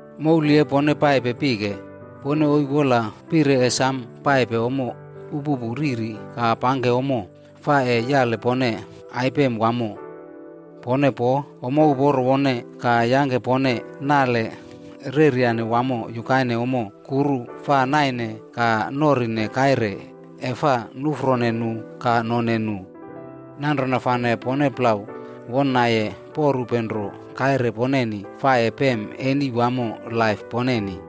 E pone paipe pike, pone isi wola pire ese samo punari ommo upupu ka pangke ommo fa yape pone aiyem wamo. Pone po ommo uporo uporo wamo ka yangke pone nale mopolwa wamo yukaine ommo kuru fa naine ka norine kaire e fa nufro nu ka none nu. Nanrona fane pone re wona poripe nro kaire poneni fa ese pem eni wamo laip poneni.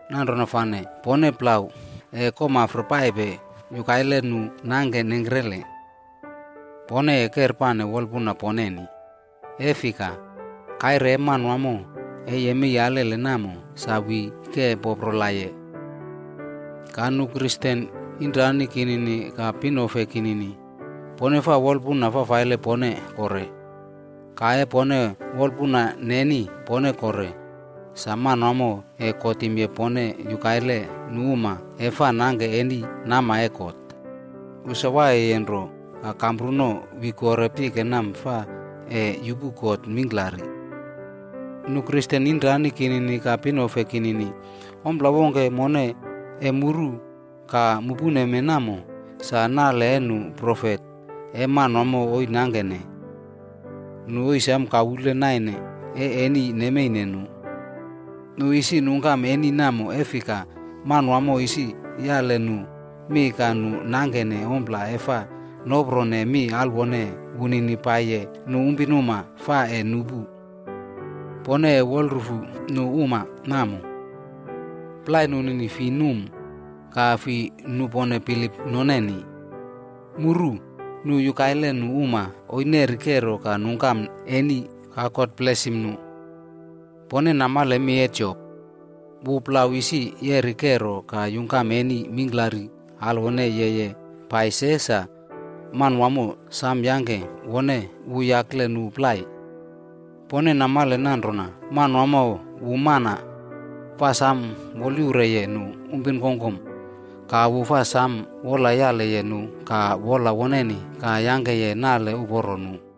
Nanrona fane pone re ese komafre paipe yukaine nu uma e fa nangke nengkre. Pone ese kerpane wolpuna poneni. E fika, Kaire e Manawamo ese yemei alele namo, sa yolowi ekrene ekreneye. Nu Kristen inomranimpi ka pinefe kinini, pone faa wolpuna fafaile pone kore. La e pone wolpuna neni pone kore, sa Manawamo ese kotim pone yukaine nu uma e fa nangke nale fafaile nama e God. Wu sa waiyeye nro ka kampruno ese yolowi kore pike mee fa ese yupu kot mingklari. Nu Kristen inomranimpi ka pinofe kinini, ompla wongke muru ka mupene namo, sa nale e nu profet e God isi nangkene. Nu isi samo komafre naine e eni nemeine nu. Nu isi nungkam eni namo e fika, Manawamo isi yali nu mi ka nu nangke fa nopro mi alwone wunini pai nu pinuma fa ese nupu. Pone ese wolrufupe nu uma namo. Plai e nu fi num ka fi nupone bilip noneni. Mu muru nu nanrona nu uma isi neri kero ka nungkam eni ka God blesim nu. Pone namale mi e Jop. Wu re isi yeri kero ka yungkam eni mingklari yeye pai se sa, Manawamo samo yangke wu uporo wamo yakle nu plai.b Pone namale nanrona Manawamo, wu mana fa samo wolyaure nu pinuma ka samo wolpalo nu ka wolyali nu wamo ka yangke nale uporo nu.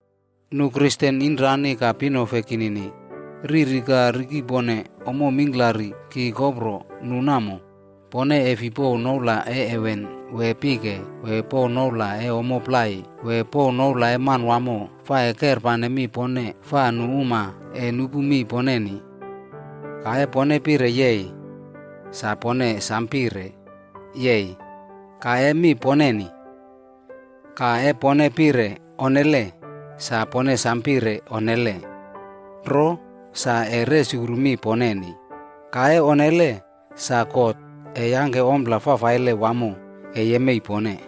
Nu Kristen inomranimpi ka pinofe kinini, riri ka rikepone ommo mingklari ki kopro nu namo, pone e fei pouw noula e heven wee pike ka pouw noula e ommo plai ka pouw noula e Manawamo fa e kerpane mi poneni fa nu uma ese nupu mi poneni. Le pone pire “yei” sa pone pire “yei” ka mi poneni. Le pone pire “onne” sa pone ese pire “onne” nro sa ese resukru mi poneni. Le onnele, sa God ese yangke ompla yemei pone.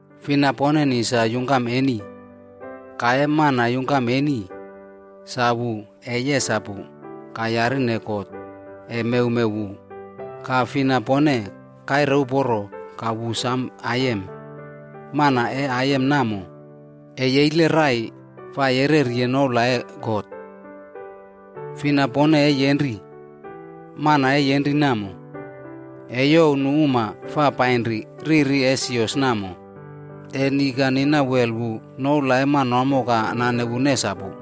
Fina e poneni sa yungkam eni? La e mana yungkam eni, wu ese yesapu ka yarine God ese mewmew wu. Ka fina poneni waiye uporo ka aiyem wamo? Mana e woluporo namo, ese yeile rai ka yereri noula e God. Fina e pone yenriye? Mana e yenriye namo, ese youw nu uma fa painri risine sios namo, ese noloni ka nina wel wu noula e Manawamo ka nane wu nesapu.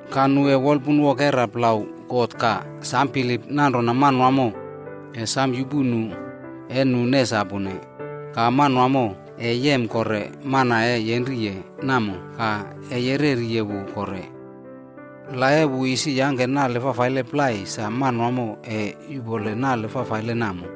Ka nu ese wolpunwokera plau God ka samo bilip nanrona Manawamo ese samo yupu mi e nu nesapune, ka Manawamo ese yem kore mana e yenriye namo ka ese yereri wu kore. La e wu isi yangke nale fafaile plai, sa Manawamo ese yuꞌpole nale fafaile namo.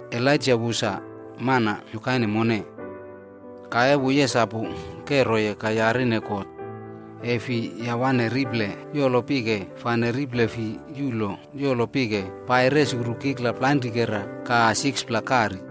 Elaijac wu sa mana yukaine mone. Wu yesapu kero ka yarine God ese fi yawane riple yolo pike ka riple fi yilo pike resukru kikla plainrikera ka 6pla kari.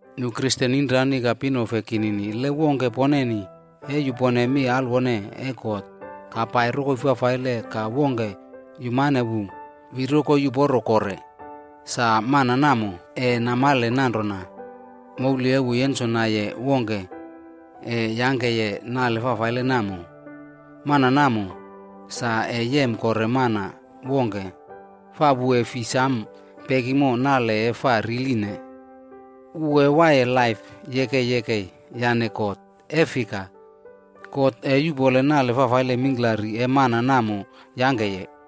Nu Kristen inomranimpi ka pinefe kinini, wongke e poneni yupone mi alwone e God ka pai rokoi fafaile ka wongke yumane wu yolowi kore rokoi uporo, sa mana namo ese namale nanrona, e wu yenmaire wongke namo fina e yangke nale fafaile namo, mana namo sa ese yem kore mana wongke fa wu ese fei samo pekini nale e riline. Wu ese waiye laip yane God nanrona nanrona. E fika, God ese yuꞌpole nale fafaile mingklari e mana namo yangkeye.